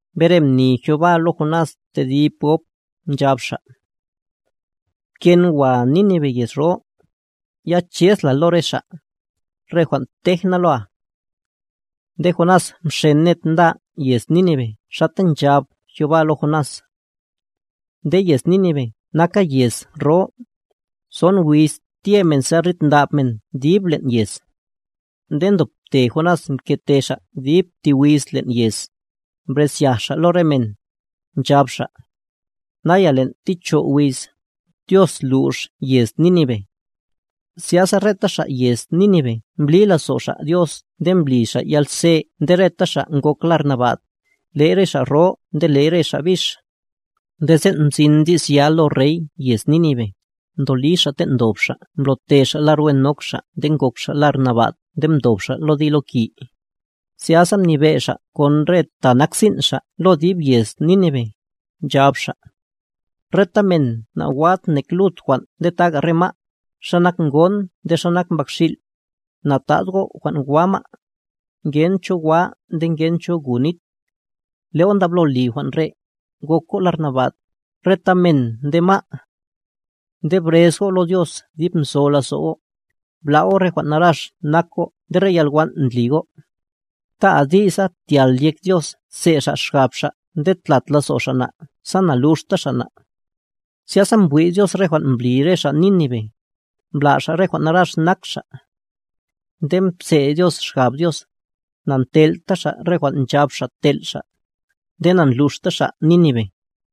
Mbere mni Jehová lo Jonás tedib gob, nchab Xa': —Pken wa Nínive yez ro, ya chez la lo re xa', re jwan' tej na loa. Nde Jonás mxen ned nda yez Nínive xata nchab Jehová lo Jonás. Nde yez Nínive naka yez ro, son wiz tye men sa rid ndab men dib len' yez. Nde ndobte Jonás mkete xa' dib ti wiz len' yez, mbrezyaj xa' lo re men, nchab xa': —Naya len' ti cho' wiz, Dios lux yez Nínive. Zyasa reta xa' yez Nínive mbli lazo' xa' Dios nde mbli xa' yalze nde reta xa' ngok lar naba'd,a le'y re xa' ro nde le'y re xa' bix. Nde sen' mzin di's ya lo rey yez Nínive, mdoli xa' ten' ndob xa' mblo'te xa' lar wen nok xa' nde ngok xa' lar nabad nde mdob xa' lo diloki. Zyasa mnibe' xa' kon re ta nak sin' xa' lo dib yez Nínive, nchab xa': —Reta men na'wad nek lud jwan' nde taga re ma', xa nak ngon nde xa nak mbakxil', na'tad go' jwan' wa ma', ngen cho wa nde ngen cho gu nit. Le' go' ndablo li jwan' re', gok go' lar naba'd, reta men nde ma'. Nde brez go' lo Dios dib nzo lazo' go', bla' go' re jwan' narax nak go' nde re yalwan' ndli go'. Ta' adi'sa tyal yek Dios tse' Xa' xgab Xa' nde ta' tlat lazo' Xa' na' sa naluxta Xa' na'. Zyasa mbwi' Dios re jwan' mbli re xa' Nínive, mbla' xa' re jwan' narax nak xa'. Nde mpse' Dios xgab Dios, na'ntel'ta Xa' re jwan' nchab Xa' tel' Xa', nde na'ndluxta Xa' Nínive.